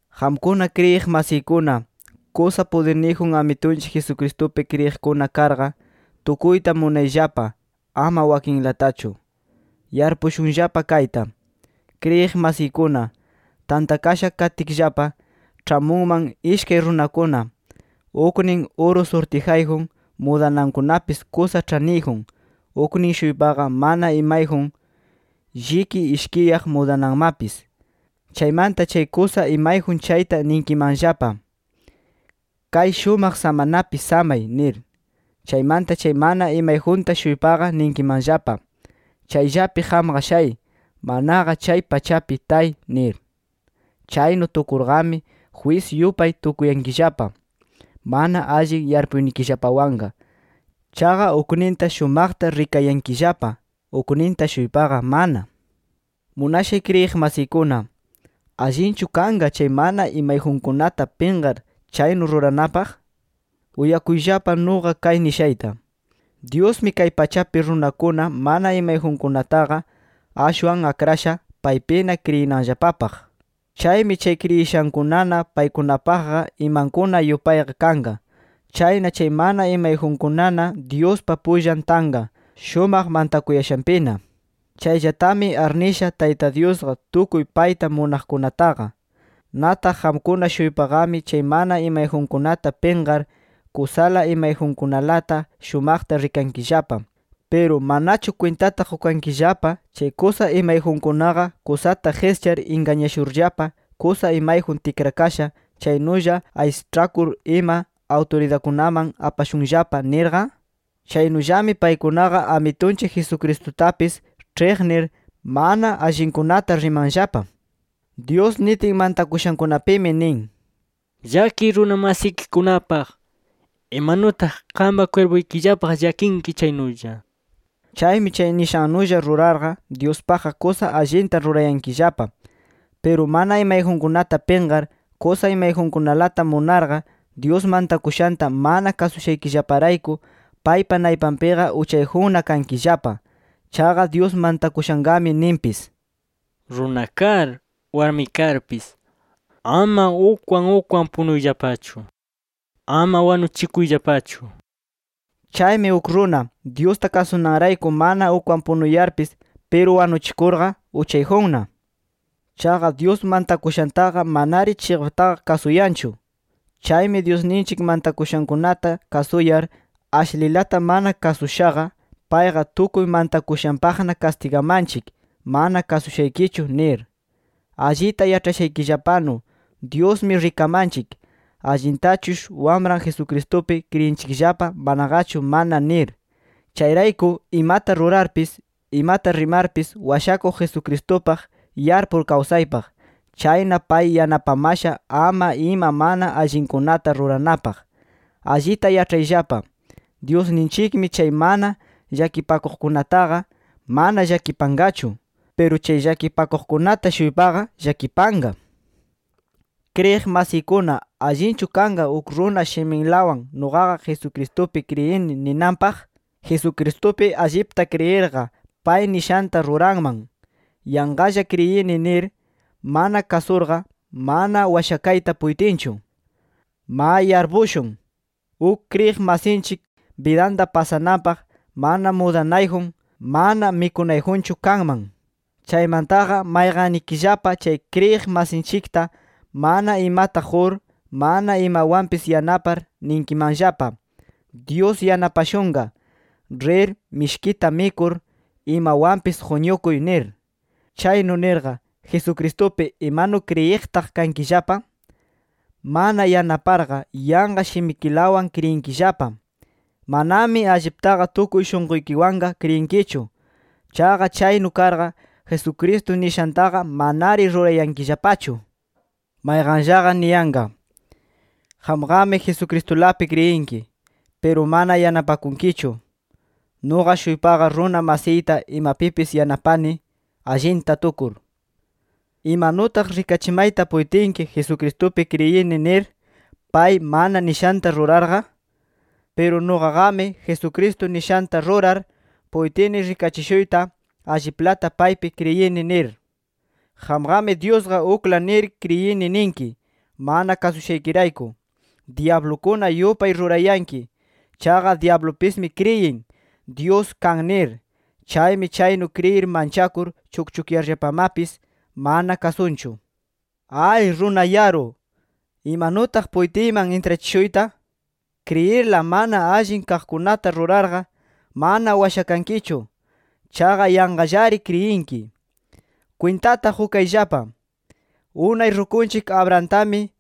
Qamkuna kriyiq masiykuna, kusa pudirniyjun Amitunchik Jesucristupi kriyiqkuna karqa, tukuyta munayllapa, ama wakinlatachu. Yarpushunllapa kayta: Kriyiq masiykuna, tantakasha katkillapa, ĉhamunman ishkay runakuna. Uknin uru surtijayjun, mudanankunapis kusa ĉhaniyjun. Uknin-shuypaqa mana imayjun, lliki ishkiyaq mudananmapis. Chaymanta chay kusa imayjun chayta ninkimanllapa: Kay shumaq samanapi samay nir. Chaymanta chay mana imayjunta-shuypaqa ninkimanllapa: Chayllapi qamqa shay, manaqa chay pachapi tay nir. Chaynu tukurqami, jwis yupay tukuyankillapa, mana allin yarpuynikillapawanqa. Chaqa ukninta shumaqta rikayankillapa, ukninta-shuypaqa mana. Munashay kriyiq masiykuna, ¿allinchu kanqa chay mana imayjunkunata pinqar chaynu ruranapaq? Uyakuyllapa nuqa kay nishayta: Dyusmi kay pachapi runakuna mana imayjunkunataqa, ashwan akrasha paypina kriyinanllapapaq. Chaymi chay kriyishankunana paykunapaqqa imankuna yupayqa kanqa. Chayna chay mana imayjunkunana Dyuspa pullan tanqa, shumaq mantakuyashanpina. Chayllatami arnisha Tayta Dyusqa tukuy payta munaqkunataqa. Nataq qamkuna-shuypaqami chay mana imayjunkunata pinqar, kusala imayjunkunalata shumaqta rikankillapa. ¿Piru manachu kwintata qukankillapa chay kusa imayjunkunaqa kusata qischar ingañashurllapa kusa imayjun tikrakasha, chaynulla aysaĉhakur ima awturidadkunaman apashunllapa nirqa? Chaynullami paykunaqa Amitunchik Jesucristutapis ĉhiqnir, mana allinkunata rimanllapa. Dyus nitin mantakushankunapimi nin: “Llakiy runa masikikunapaq, imanutaq qampa kwirpuykillapaq llakinki chaynulla” nir. Chaymi chay nishannulla rurarqa, Dyuspaqqa kusa allinta rurayankillapa. Piru mana imayjunkunata pinqar, kusa imayjunkunalata munarqa, Dyus mantakushanta mana kasushaykillaparayku, paypa naypanpiqa uchayjunna kankillapa. Chaqa Dyus mantakushanqami ninpis: “Runa kar, warmi karpis, ama ukwan ukwan punuyllapachu. Ama wanuchikuyllapachu” nir. Chaymi uk runa, Dyusta kasunanrayku mana ukwan punuyarpis, piru wanuchikurqa uchayjunna. Chaqa Dyus mantakushantaqa manari chiqaptaqa kasuyanchu. Chaymi Dyusninchik mantakushankunata kasuyar, ashlilata mana kasushaqa, payqa tukuy mantakushanpaqna kastigamanchik, mana kasushaykichu nir. Allita yaĉhashaykillapanu, Dyusmi rikamanchik, allintachush Wamran Jesucristupi kriyinchikllapa manaqachu mana nir. Chayrayku imata rurarpis, imata rimarpis Washakuq Jesucristupaq yarpur kawsaypaq. Chayna pay yanapamasha ama ima mana allinkunata ruranapaq. Allita yaĉhayllapa, Dyusninchikmi chay mana llakipakuqkunataqa, mana llakipanqachu. Piru chay llakipakuqkunata-shuypaqa, llakipanqa. Kriyiq masiykuna ¿allinchu kanqa uk runa shiminlawan “Nuqaqa Jesucristupi kriyini” ninanpaq? Jesucristupi allipta kriyirqa, pay nishanta ruranman. Yanqalla kriyini nir, mana kasurqa, mana washakayta puytinchu. Ma yarpushun, uk kriyiq masinchik bidanta pasananpaq mana mudanayjun, mana mikunayjunchu kanman. Chaymantaqa mayqannikillapa chay kriyiq masinchikta mana imata qur, mana imawanpis yanapar, ninkimanllapa: Dyus yanapashunqa. Rir, mishkita mikur, imawanpis quñukuy nir. Chaynu nirqa, ¿Jesucristupi imanu kriyiqtaq kankillapa? Mana yanaparqa, yanqa shimikilawan kriyinkillapa. Manami alliptaqa tukuy shunquykiwanqa kriyinkichu. Chaqa chaynu karqa, Jesucristo nishantaqa manari rurayankillapachu. Mayqanllaqa niyanqa: —Qamqami Jesucristulapi kriyinki, piru mana yanapakunkichu. Nuqa-shuypaqa runa masiyta imapipis yanapani, allinta tukur. ¿Imanutaq rikachimayta puytinki Jesucristupi kriyini nir, pay mana nishanta rurarqa? Piru nuqaqami, Jesucristo nishanta rurar, puytini rikachishuyta, alliplata paypi kriyini nir. Qamqami Dyusqa ukla nir kriyini ninki. Mana kasushaykirayku dyablukuna yupay rurayanki. Chaqa dyablupismi kriyin, Dyus kan nir. Chaymi chaynu kriyir manchakur chukchukyarllapamapis, mana kasunchu. ¡Ay, runa yaru! ¿Imanutaq puytiyman intrachishuyta? Kriyirla, mana allin kaqkunata rurarqa, mana washakankichu. Chaqa yanqallari kriyinki. Kwintata qukayllapa. Unay rukunchik Abrahamtami,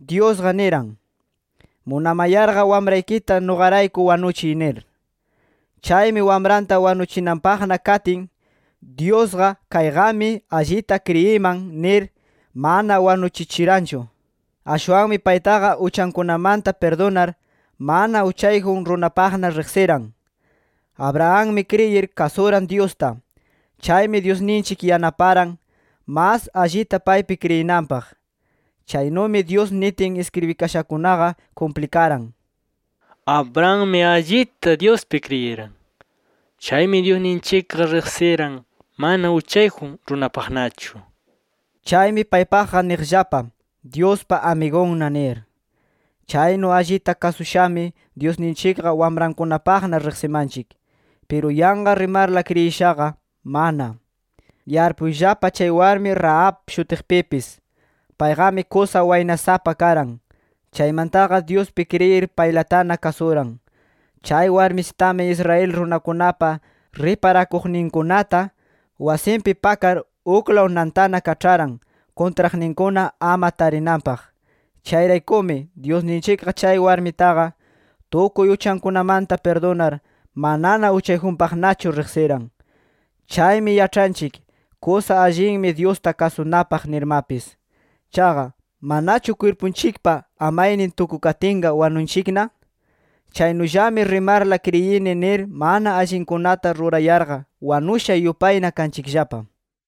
Dyusqa niran: “Munamayarqa wamraykita nuqarayku wanuchiy” nir. Chaymi wamranta wanuchinanpaqna katin, Dyusqa “Kayqami allita kriyiman” nir, mana wanuchichiranchu. Ashwanmi paytaqa uchankunamanta pirdunar, mana uchayjun runapaqna riqsiran. Abrahammi kriyir, kasuran Dyusta. Chaymi Dyusninchik yanaparan, mas allita paypi kriyinanpaq. Chaynumi Dyus nitin iskribikashakunaqa kumplikaran: “Abrahammi allita Dyuspi kriyiran. Chaymi Dyusninchikqa riqsiran mana uchayjun runapaqnachu”. Chaymi paypaqqa niqllapa: “Dyuspa amigunna” nir. Chaynu allita kasushami, Dyusninchikqa wamrankunapaqna riqsimanchik. Piru yanqa rimarla kriyishaqa, mana. Yarpuyllapa chay warmi Rahab shutiqpipis. Payqami kusa waynasapa karan. Chaymantaqa Dyuspi kriyir, paylatana kasuran. Chay warmisitami Israel runakunapa riparakuqninkunata, wasinpi pakar uklaw nantana kaĉharan, kuntraqninkuna ama tarinanpaq. Chayraykumi, Dyusninchikqa chay warmitaqa, tukuy uchankunamanta pirdunar, manana uchayjunpaqnachu riqsiran. Chaymi yaĉhanchik, kusa allinmi Dyusta kasunapaq nirmapis. Chaqa ¿manachu kwirpunchikpa amaynin tukukatinqa wanunchikna? Chaynullami rimarla kriyini nir mana allinkunata rurayarqa wanusha yupayna kanchikllapa.